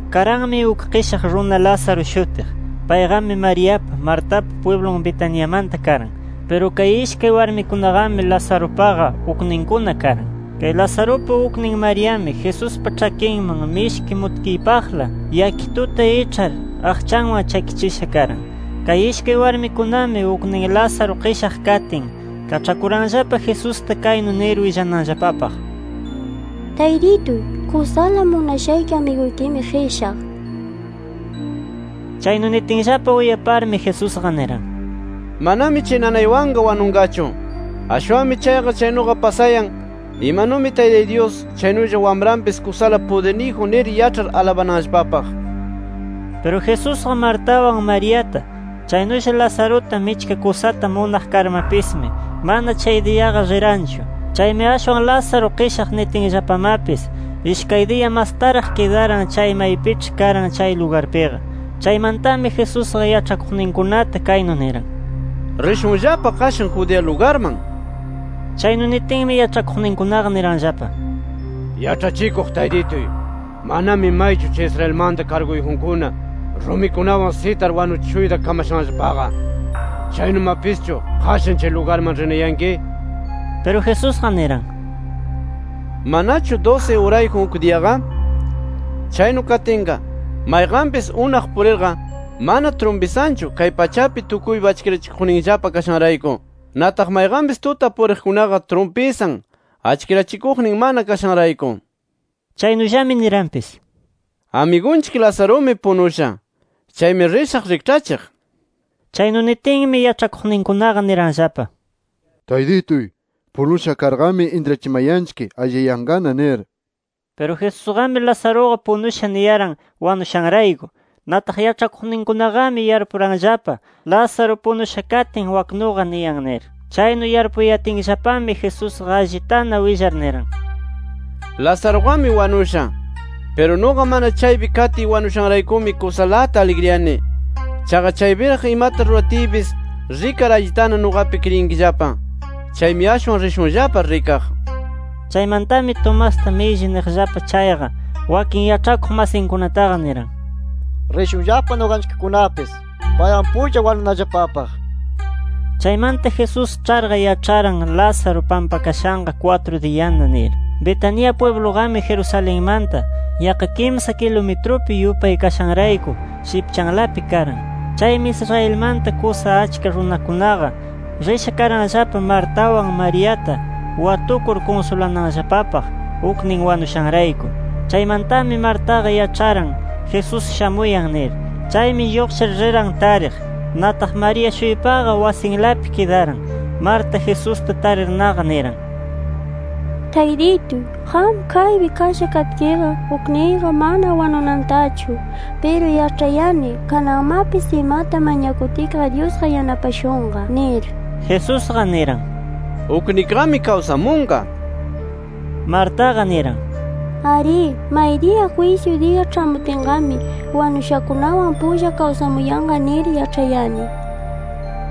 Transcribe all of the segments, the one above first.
Karanmi uk qishaq runa Lázaro shutiq. Payqami Mariapa, Martapa pwiblun Betaniamanta karan. Piru kay ishkay warmikunaqami Lazarupaqa ukninkuna karan. Kay Lazarupa uknin Mariami Jesuspa ĉhakinman mishki mutkiypaqla yakituta iĉhar, aqchanwan chakichisha karan. Kay ishkay warmikunami, uknin Lázaro qishaq katin, kaĉhakuranllapa Jesusta kaynu nir willananllapapaq: —Taytituy, kusala munashayki amiguykimi qishaq nir. Chaynu nitinllapa uyaparmi, Jesusqa niran: —Manami chay nanaywanqa wanunqachu. Ashwanmi chayqa chaynuqa pasayan imanumi Taytay Dyus, chaynulla Wamranpis kusala pudirniyjun nir yaĉhar alabananllapapaq. Piru Jesusqa, Martawan Mariata chaynulla Lazaruta michka kusata munaq karmapismi, mana chay diyaqa riranchu. Chaymi ashwan Lázaro qishaq nitinllapamapis, ishkay diya mastaraq kidaran chay maypiĉhi karan chay lugarpiqa. Chaymantami Jesusqa yaĉhakuqninkunata kaynu niran: —Rishunllapa qashan Judea lugarman nir. Chaynu nitinmi, yaĉhakuqninkunaqa niranllapa: —Yaĉhachikuq Taytituy, manami maychu chay Israelmanta karguyjunkuna rumikunawan sitar wanuchishuyta kamashanllapaqa. Chaynumapischu, ¿qashan chay lugarman rinayanki? Piru Jesusqa niran: —¿Manachu dusi urayjun uk diyaqa? Chaynu katinqa, mayqanpis unaq purirqa mana trumpisanchu, kay pachapi tukuypa achkirachikuqninchikllapa kashanrayku. Nataq mayqanpis tuta puriqkunaqa trumpisan, achkirachikuqnin mana kashanrayku. Chaynullami niranpis: —Amigunchik Lazarumi punusha. Chaymi rishaq rikĉhachiq nir. Chaynu nitinmi, yaĉhakuqninkunaqa niranllapa: —Taytituy, punusha karqami intrachimanchik alliyayanqana nir. Piru Jesusqami, Lazaruqa punusha niyaran, wanushanrayku. Nataq yaĉhakuqninkunaqami yarpuranllapa Lázaro punusha katin waknuqa niyan nir. Chaynu yarpuyatinllapami, Jesusqa allitana willar niran: —Lazaruqami wanusha. Piru nuqa mana chaypi katiy wanushanraykumi kusalata aligriyani. Chaqa chaypiraq imata ruratiypis rikar allitana nuqapi kriyinkillapa. Chaymi ashwan rishunllapa rikaq. Chaymantami, Tomasta milli niqllapa chayqa, wakin yaĉhakuq masinkunataqa niran: —Rishunllapa nuqanchikkunapis, paywan pulla wanunallapapaq, nir. Chaymanta Jesús ĉharqa yaĉharan Lázaro pampakashanqa kwatru diyana nir. Betania pwibluqami Jerusalenmanta yaqqa kimsa kilumitrupi yupay kashanrayku shipchanlapi karan. Chaymi Israelmanta kusa achka runakunaqa risha karanllapa Martawan Mariata, watukur kunsulananllapapaq uknin wanushanrayku. Chaymantami Martaqa yaĉharan, Jesús shamuyan nir. Chaymi lluqshir riran tariq. Nataq María-shuypaqa wasinlapi kidaran. Marta, Jesusta tarirnaqa niran: —Taytituy, qam kaypi kasha katkiqa, ukniyqa mana wanunantachu. Piru yaĉhayani, kananmapis imata mañakutkiqa Dyusqa yanapashunqa nir. Jesusqa niran: —Uknikiqami kawsamunqa nir. Martaqa niran: —Arí, maydiya jwisyu diya ĉhamutinqami, wanushakunawan pulla kawsamuyanqa nir yaĉhayani.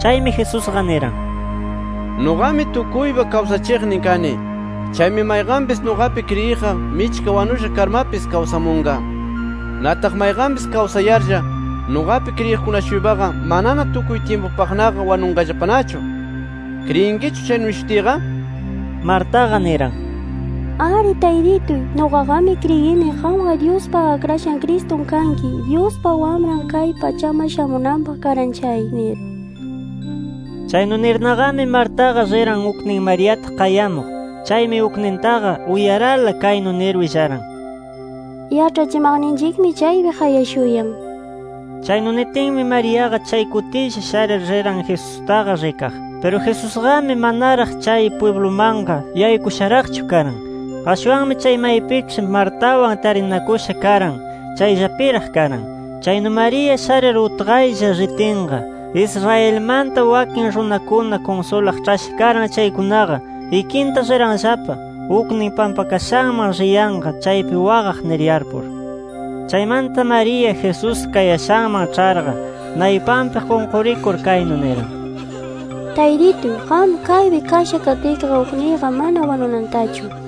Chaymi Jesusqa niran: —Nuqami tukuypa kawsachiqnin kani. Chaymi mayqanpis nuqapi kriyiqqa michka wanusha karmapis kawsamunqa. Nataq mayqanpis kawsayarlla nuqapi kriyiqkuna-shuypaqa, manana tukuy tyimpupaqnaqa wanunqallapanachu. ¿Kriyinkichu chaynu nishutiyqa? nir. Martaqa niran: —Arí Taytituy. Nuqaqami kriyini qamqa Dyuspa Akrashan Cristun kanki, Dyuspa Wamran kay pachaman shamunanpaq karan chay, nir. Chaynu nirnaqami, Martaqa riran uknin Mariata qayamuq. Chaymi uknintaqa uyarala kaynu nir willaran: —Yaĉhachimaqninchikmi chaypi qayashuyan nir. Chaynu nitinmi, Mariaqa chay kutilla sharir riran Jesustaqa rikaq. Piru Jesusqami, manaraq chay pwiblumanqa yaykusharaqchu karan. Ashwanmi chay maypiĉhi Martawan tarinakusha karan, chayllapiraq karan. Chaynu María sharir utqaylla ritinqa, Israelmanta wakin runakuna kunsulaq ĉhasha karan chaykunaqa ikinta riranllapa uknin pampakashanman riyanqa chaypi waqaq nir yarpur. Chaymanta María, Jesús kayashanman ĉharqa, naypanpi qunqurikur kaynu niran: —Taytituy, qam kaypi kasha katkiqa, ukniyqa mana wanunantachu nir.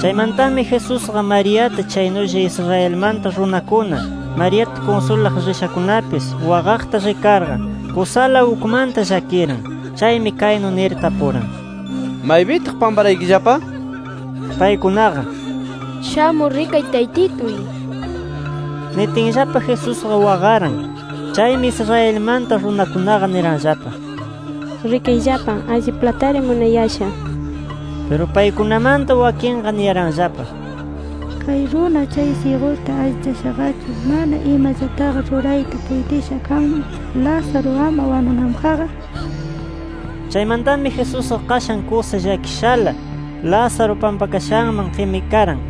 Chaymantami Jesusqa Mariata, chaynulla Israelmanta runakuna Mariata kunsulaq rishakunapis waqaqta rikarqa kusala ukmanta llakiran. Chaymi kaynu nir tapuran: —¿Maypitaq pamparaykillapa? Paykunaqa, —Shamur rikay Taytituy— nitinllapa, Jesusqa waqaran. Chaymi Israelmanta runakunaqa niranllapa: —¡Rikayllapa alliplatari munayasha! Piru paykunamanta wakinqa, niyaranllapa: —Kay runa, chay syiguta allichashaqachu ¿mana imallataqa rurayta puytisha kanman, Lázaro ama wanunanpaqqa? nir. Chaymantami Jesusqa qashan kusa llakishala, Lázaro pampakashanman qimikaran.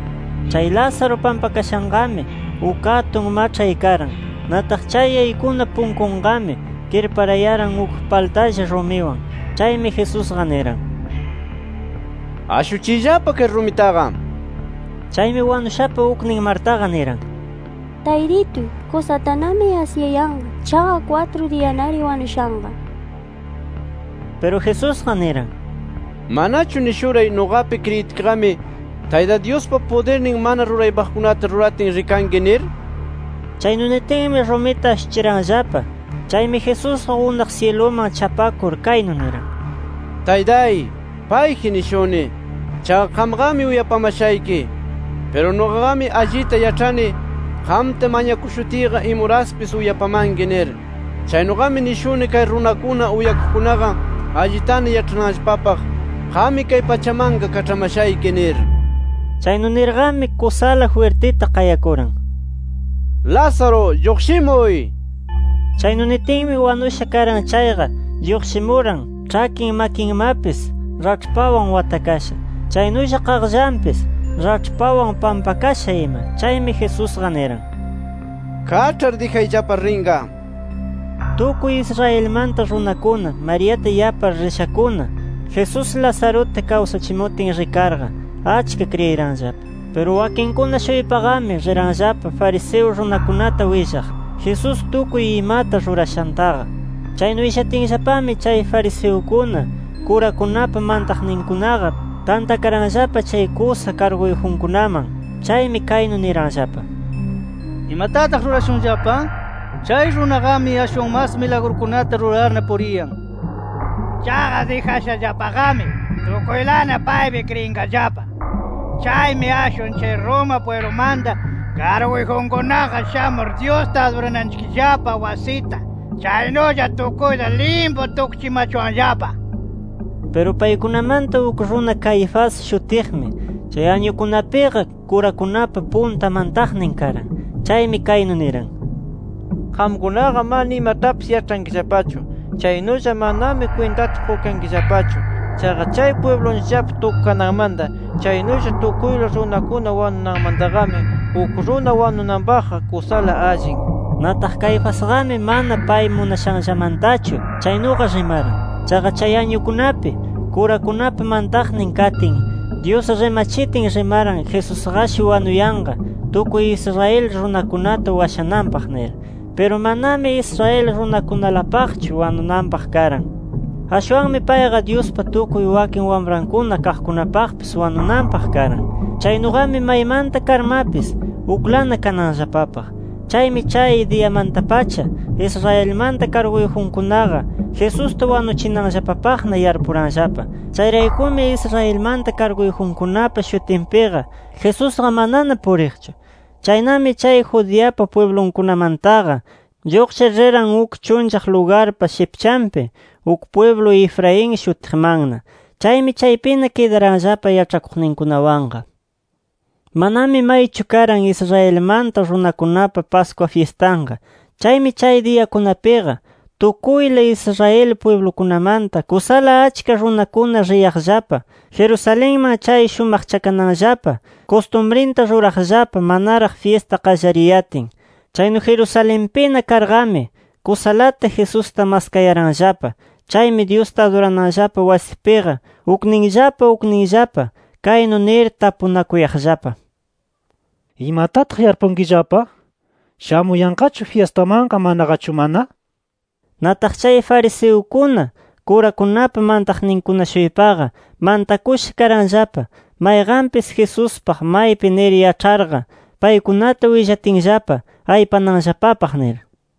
Chay Lázaro pampakashanqami uk atun maĉhay karan. Nataq chay yaykuna punkunqami kirparayaran uk paltalla rumiwan. Chaymi Jesusqa niran: —Ashuchiyllapa kay rumitaqa, nir. Chaymi wanushapa uknin Martaqa, niran: —Taytituy, kusatanami asyayanqa. Chaqa kwatru diyanari wanushanqa nir. Piru Jesusqa niran: —¿Manachu nishuray, nuqapi kriyitkiqami Tayta Dyuspa pudirnin mana ruraypaqkunata ruratin rikanki? nir. Chaynu nitinmi, rumita ashuchiranllapa. Chaymi Jesusqa unaq syiluman chapakur, kaynu niran: “Taytay, payji nishuni. Chaqa qamqami uyapamashayki. Piru nuqaqami allita yaĉhani, qamta mañakushutiyqa imuraspis uyapamanki nir. Chaynuqami nishuni: Kay runakuna uyakuqkunaqa allitana yaĉhananllapapaq, qammi kay pachamanqa kaĉhamashayki nir”. Chaynu nirqami, kusala jwirtita qayakuran: —¡Lázaro, lluqshimuy! nir. Chaynu nitinmi wanusha karan chayqa lluqshimuran, ĉhakin, makinmapis raĉhpawan watakasha. Chaynulla qaqllanpis raĉhpawan pampakasha ima. Chaymi Jesusqa niran: —Kaĉhar dijayllapa rinqa, nir. Tukuy Israelmanta runakuna Mariata yapar rishakuna, Jesús Lazaruta kawsachimutin rikarqa, achka kriyiranllapa. Piru wakinkuna-shuypaqami riranllapa fariseo runakunata willaq, Jesús tukuy imata rurashantaqa. Chaynu willatinllapami chay fariseukuna, kurakunapa mantaqninkunaqa tantakaranllapa chay kusa karguyjunkunaman. Chaymi kaynu niranllapa: —¿Imatataq rurashunllapa? Chay runaqami ashwan mas milagrukunata rurarna puriyan. Chaqa dijashallapaqami tukuylana paypi kriyinqallapa. Chaymi ashwan chay Roma pwiblumanta karguyjunkunaqa shamur Dyusta adurananchikllapa wasita, chaynulla tukuyta limpu tukchimachuwanllapa nir. Piru paykunamanta uk runa Caifás shutiqmi, chay añukunapiqa kurakunapa punta mantaqnin karan. Chaymi kaynu niran: —Qamkunaqa mana imatapis yaĉhankillapachu. Chaynulla manami kwintata qukankillapachu. Chaqa chay pwiblunchikllapa tukukananmanta chaynulla tukuyla runakuna wanunanmantaqami uk runa wanunanpaqqa kusala allin nir. Nataq Caifasqami mana pay munashanllamantachu chaynuqa rimaran. Chaqa chay añukunapi kurakunapa mantaqnin katin, Dyus rimachitin, rimaran Jesusqashi wanuyanqa tukuy Israel runakunata washananpaq nir. Piru manami Israel runakunalapaqchu wanunanpaq karan. Ashwanmi payqa Dyuspa tukuy wakin wamrankuna kaqkunapaqpis wanunanpaq karan. Chaynuqami maymanta karmapis uklana kananllapapaq. Chaymi chay diyamanta-pacha, Israelmanta karguyjunkunaqa Jesusta wanuchinanllapapaqna yarpuranllapa. Chayraykumi Israelmanta karguyjunkunapa shutinpiqa, Jesusqa manana puriqchu. Chaynami chay Judeapa pwiblunkunamantaqa lluqshir riran uk chunllaq lugarpa shipchanpi uk pwiblu Efraín shutiqmanna. Chaymi chaypina kidaranllapa yaĉhakuqninkunawanqa. Manami maychu karan Israelmanta runakunapa Pascua fyistanqa. Chaymi chay diyakunapiqa tukuyla Israel pwiblukunamanta kusala achka runakuna riyaqllapa Jerusalenman chay shumaqchakananllapa kustumrinta ruraqllapa manaraq fyista qallariyatin. Chaynu Jerusalenpina karqami, kusalata Jesusta maskayaranllapa. Chaymi Dyusta adurananllapa wasipiqa ukninllapa ukninllapa kaynu nir tapunakuyaqllapa: “¿Imatataq yarpunkillapa? ¿Shamuyanqachu fyistamanqa, manaqachu mana?” nir. Nataq, chay fariseukuna, kurakunapa mantaqninkuna-shuypaqa mantakusha karanllapa, mayqanpis Jesuspaq maypi nir yaĉharqa, paykunata willatinllapa aypananllapapaq nir.